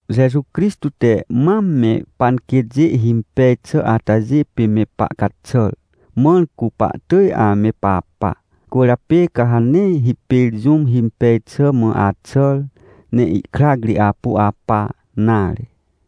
Jeju Crixtô te mam me panquêtjê himpej xà atajê pê me pahcaxàr, mãr cu pahtỳj ame papa. Cwỳrjapê ca ha nee hipêr jũm himpej xà mã axàr, ne ihkrac ri apu apa nare.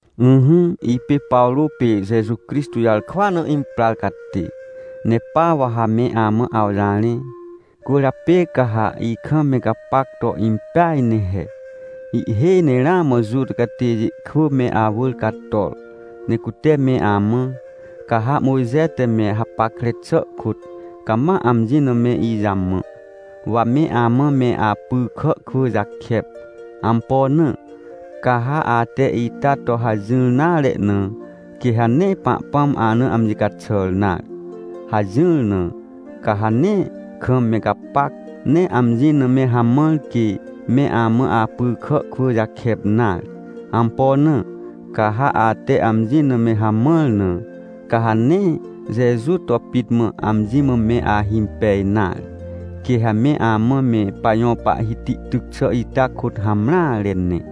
Ỹhỹ, ipê Pawrô pê Jeju Crixtô jarkwa na imprar catê, ne pa wa ha me amã awjarẽ, cwỳrjapê ca ha ikam me gapac to impeaj ne he. Ihhêj ne ramã Juta catêjê kwỳ me awỳr cator, ne cute me amã: — Ca ha Mojxe te me hapackre xà kôt, cama amji na me ijamã, wa me amã me apy kà kwỳ jakep. Ampo na? Ca ha ate ita to hajỹr nare na, quê ha nee Pahpãm ana amji caxàr nare — hajỹr na. Ca ha nee kam me gapac, ne amji na me hamãr, quê me amã apy kà kwỳ jakep nare. Ampo na? Ca ha ate amji na me hamãr na, ca ha nee Jeju to pit mã amji mã me ahimpej nare. Quê ha me amã me pajõ Pahhiti tyc xà ita kôt hamreare ne.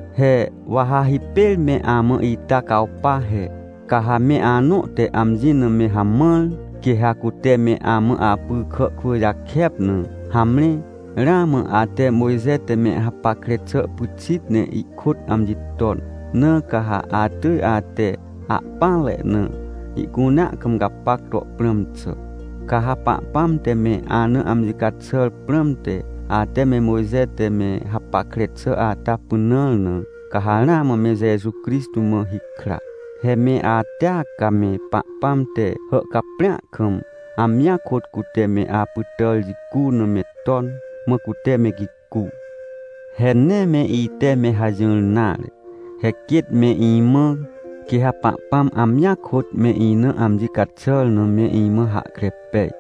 He wa ha hipêr me amã ita cawpa he. Ca ha me anõ te amji na me hamãr, quê ha cute me amã apy kà kwỳ jakep na, hamre, ramã ate Mojxe te me hapackre xà pyxit ne ihkôt amji ton, na ca ha atỳj ate ahpỹanre na ihcunea kam gapac to prãm xà. Ca ha Pahpãm te me ana amji caxàr prãmte, ate me Mojxe te me hapackre xà ata pynãr na, ca ha ramã me Jeju Crixtô mã hikra. He me atea ca me Pahpãm te hàhcaprĩa kam, amjia kôt cute me apytàr jicu na me ton, mã cute me gicu. He nee me ite me hajỹr nare. He quêt me imã quê ha Pahpãm amjia kôt me ina amji caxàr na me imã hahkre pej.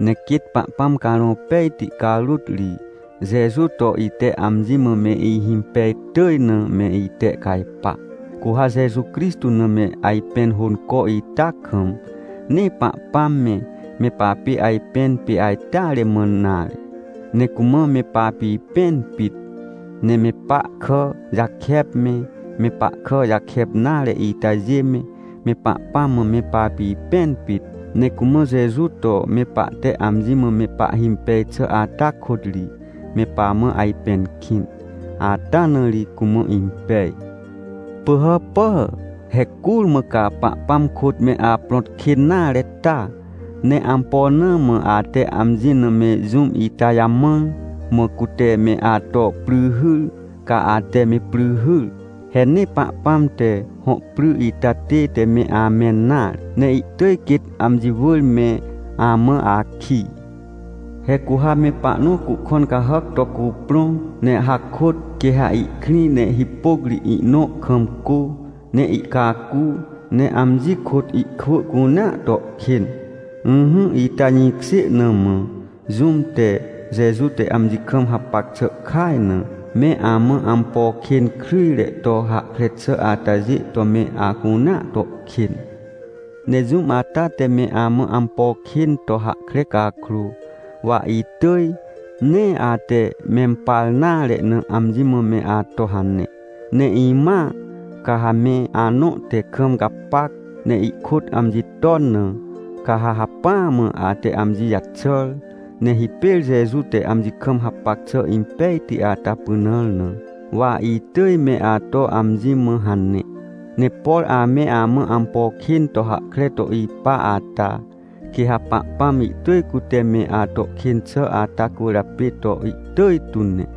Ne quêt Pahpãm Carõ Pejti carôt ri, Jeju to ite amji mã me ihimpej tỳj na me itehcajpa. Cu ha Jeju Crixtô na me ajpẽn hônco ita kam, nee Pahpãm me, me papê ajpẽn pê ajteare mã nare, ne cumã me papipẽn pit. Ne me pahkà jakep me, me pahkà jakep nare itajê me, me Pahpãm mã me papipẽn pit. Ne cumã Jeju to me pahte amji mã me pahhimpej xà ata kôt ri me pamã ajpẽn kĩn, ata na ri cumã impej. Pỳhàpà! He curmã ca Pahpãm kôt me aprõt kên nare ta? Ne ampo na mã ate amji na me jũm ita jamãr, mã cute me ato pry hyr, ca ate me pry hyr? He nee Pahpãm te hõ pry ita tête me amẽn nare, ne ihtỳj quêt amji wỳr me amã akij. He cu ha me pahnõ cuhkõn cahàc to cuprõ, ne hakôt, quê ha ihkrĩ ne hipôc ri ihnõ kam cô, ne ihcacu, ne amji kôt ihkwỳ cunea to kên. Ỹhỹ, ita jĩkjê na mã jũm te, Jeju te amji kam hapac xà kaj na, me amã ampo kên kryjre to hahkre xà atajê to me acunea to kên. Ne jũm ata te me amã ampo kên to hahkre cakrô, wa itỳj, nee ate mempar nare na, amji mã me ato hane. Ne imãa, ca ha me anõ te kam gapac, ne ihkôt amji ton na, ca ha hacpỹa mã ate amji jaxàr, ne hipêr Jeju te amji kam hapac xà impejti ata pynãr na, wa itỳj me ato amji mã hane. Ne por ame amã ampo kên to hahkre to ipa ata, quê ha Pahpãm ihtỳj cute me ato kên xà ata cwỳrjapê to ihtỳj tu ne.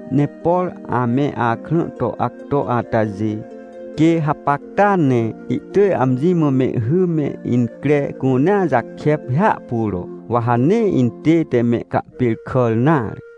Ne por ame akrã to acto atajê, quê hapacta ne ihtỳj amji mã mehhy me incre cunea jakep hiahpuro, wa ha nee intête mehcahpêrkàr nare.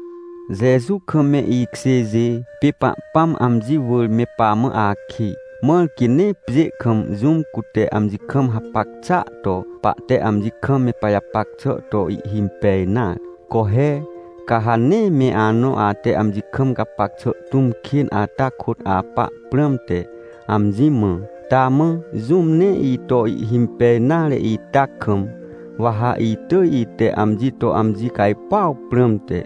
Jeju kam me ikjêjê, pê Pahpãm amji wỳr me pamã akij, mãr quê nee pjê kam jũm cute amji kam hapac xàa to pahte amji kam me pajapac xà to ihhimpej nare. Co he! Ca ha nee me anõ ate amji kam gapac xà tũm kên ata kôt apa prãmte, amji mã: — Taa mã, jũm nee ito ihhimpej nare ita kam, wa ha itỳj ite amji to amji cajpuaw prãmte,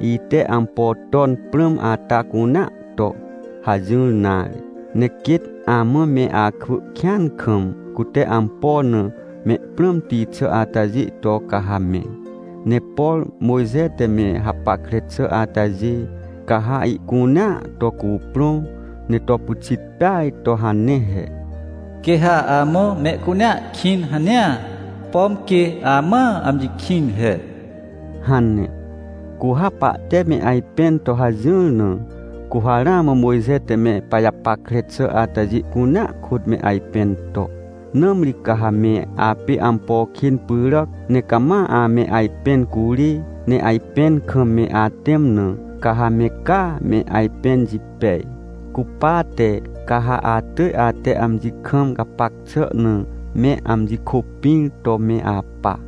ite ampo ton prãm ata cunea to — hajỹr nare. Ne quêt amã me akwỳ kĩan kam, cute ampo na mehprãmti xà atajê to ca ha me. Ne por Mojxe te me hapackre xà atajê, ca ha ihcunea to cuprõ, ne to pyxit peaj to hane he: “Quê ha amã mehcunea kĩn hanea, pom quê amãa amji kĩn he” hane. Cu ha pahte me ajpẽn to hajỹr na, cu ha ramã Mojxe te me pajapackre xà atajê cunea kôt me ajpẽn to. Nãmri ca ha me apê ampo kên pyràc, ne cama ame ajpẽn curê, ne ajpẽn kam me atẽm na, ca ha me caa me ajpẽn jipej. Cupate ca ha atỳj ate amji kam gapac xà na me amji kôpĩr to me apa.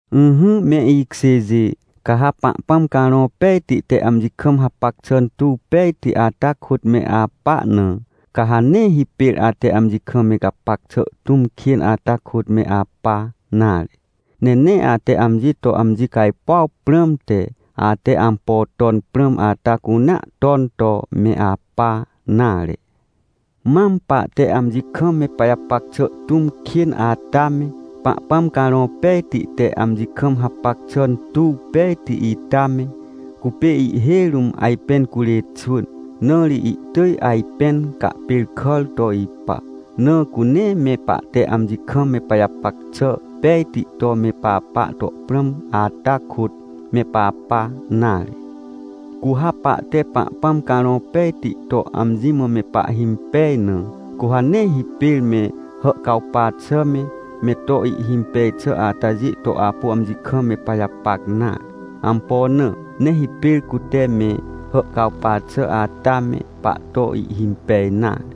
Ỹhỹ me ikjêjê, ca ha Pahpãm Carõ Pejti te amji kam hapac xà tuw pejti ata kôt me apa na, ca ha nee hipêr ate amji kam me gapac xà tũm kên ata kôt me apa nare. Ne nee ate amji to amji cajpuaw prãmte, ate ampo ton prãm ata cunea ton to me apa nare. Mam pahte amji kam me pajapac xà tũm kên ata me, Pahpãm Carõ Pejti te amji kam hapac xà tuw pejti ita me, cupê ihhêj rũm ajpẽn curê xwỳn. Na ri ihtỳj ajpẽn cahpêrkàr to ipa. Na cu nee me pahte amji kam me pajapac xà pejti to me papa to prãm ata kôt me papa nare. Cu ha pahte Pahpãm Carõ Pejti to amji mã me pahhimpej na, cu ha nee hipêr me hàhcawpa xà me, me to ihhimpej xà atajê to apu amji kam me pajapac nare. Ampo na? Nee hipêr cute me hàhcawpa xà ata me pahto ihhimpej nare.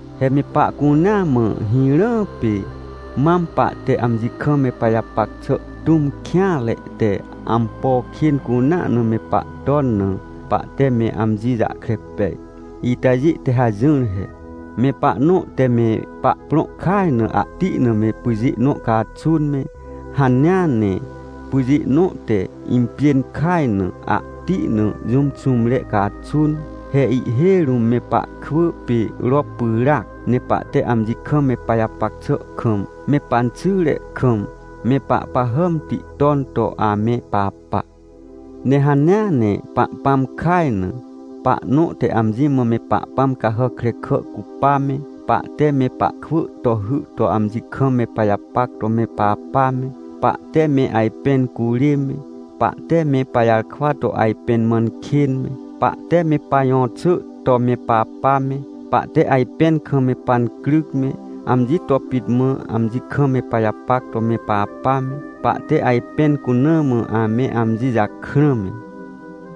He me pahcunea mã hirãa pê mam pahte amji kam me pajapac xà tũm kêanre te ampo kên cunea na me pahton na, pahte me amji jahkre pej. Itajê te hajỹr he: Me pahnõ te me pahprõ kaj na ahti na me pyjê nõ caxun me, hanea ne pyjê nõ te impjên kaj na, ahti na jũm xũmre caxun. He ihhêj rũm me pahkwỳ pê rop pyràac, ne pahte amji kam me pajapac xà kam me panxyre kam me pahpahàmti ton to ame papa. Ne hanea ne Pahpãm kaj na, pahnõ te amji mã me pahpãm cahàc krekà cupa me, pahte me pahkwỳ to hy to amji kam me pajapac to me papa me, pahte me ajpẽn curê me, pahte me pajarkwa to ajpẽn mãn kên me, pahte me pajõxỳ to me papa me, pahte ajpẽn kam me pancryc me, amji to pit mã amji kam me pajapac to me papa me, pahte ajpẽn cuna mã ame amji jakrã me,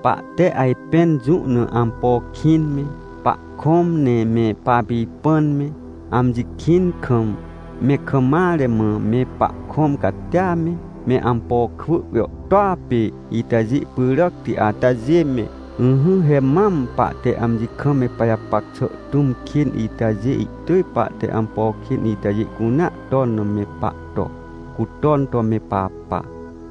pahte ajpẽn jũ na ampo kĩn me, pahkõm ne me papipãn me, amji kĩn kam, me kam mare mã me pahkõm catia me, me ampo kwỳ jàhtôa pê itajê pyràcti atajê me. Ỹhỹ, he mam pahte amji kam me pajapac xà tũm kên itajê, ihtỳj pahte ampo kên itajê cunea ton na me pahto, cu ton to me papa.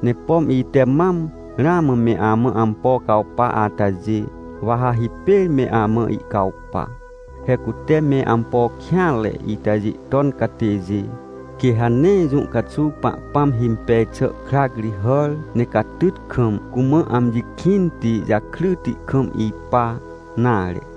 Ne pom ite mam ramã me amã ampo cawpa atajê, wa ha hipêr me amã ihcawpa. He cute me ampo kêanre itajê ton catêjê, quê ha nee jũ caxuw Pahpãm himpej xà krac ri hàr, ne catyt kam, cumã amji kĩnti jakryti kam ipa nare.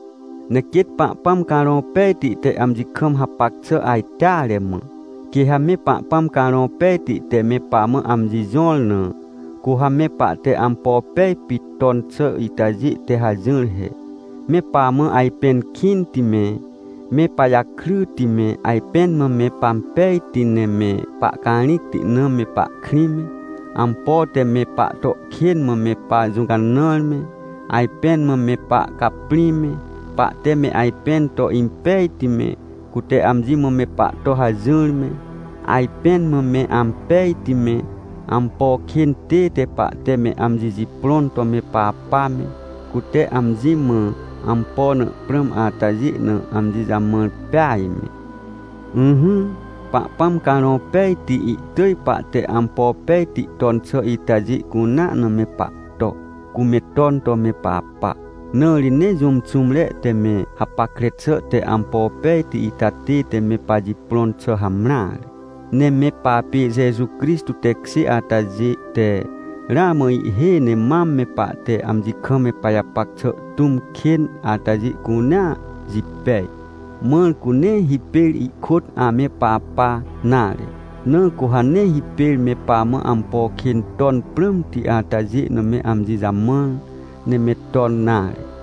Ne quêt Pahpãm Carõ Pejti te amji kam hapac xà ajteare mã. Quê ha me Pahpãm Carõ Pejti te me pamã amji jõr na, cu ha me pahte ampo pej pit ton xà itajê te hajỹr he: me pamã ajpẽn kĩnti me, me pajakryti me, ajpẽn mã me pampejti ne me pahcarĩcti na me pahkrĩ me, ampo te me pahto kên mã me pajũcanãr me, ajpẽn mã me pahcaprĩ me, pahte me ajpẽn to impejti me, cute amji mã me pahto hajỹr me, ajpẽn mã me ampejti me, ampo kên tête pahte me amji jiprõn to me papa me, cute amji mã ampo na prãm atajê na amji jamãr peaj me. Ỹhỹ, Pahpãm Carõ Pejti ihtỳj pahte ampo pejti ton xà itajê cunea na me pahto, cu me ton to me papa. Na ri nee jũm xũmre te me hapackre xà te ampo pejti ita tête me pajiprõn xà hamreare. Ne me papê Jeju Crixtô tekjê atajê te, ramã ihhêj ne mam me pahte amji kam me pajapac xà tũm kên atajê cunea jipej, mãr cu nee hipêr ihkôt ame papa nare. Na cu ha nee hipêr me pamã ampo kên ton prãmti atajê na me amji jamãr, ne me ton nare.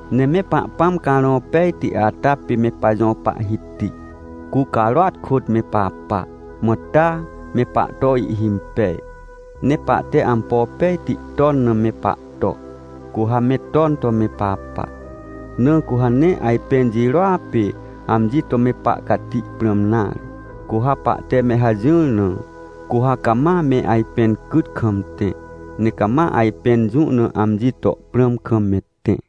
Ne me Pahpãm Carõ Pejti ata pê me pajõ Pahhiti, cu carôat kôt me papa. Mã taa, me pahto ihhimpej, ne pahte ampo pejti ton na me pahto, cu ha me ton to me papa. Na cu ha nee ajpẽn jirôa pê amji to me pahcati prãm nare. Cu ha pahte me hajỹr na, cu ha cama me ajpẽn cyt kam tẽ, ne cama ajpẽn jũ na amji to prãm kam me tẽ.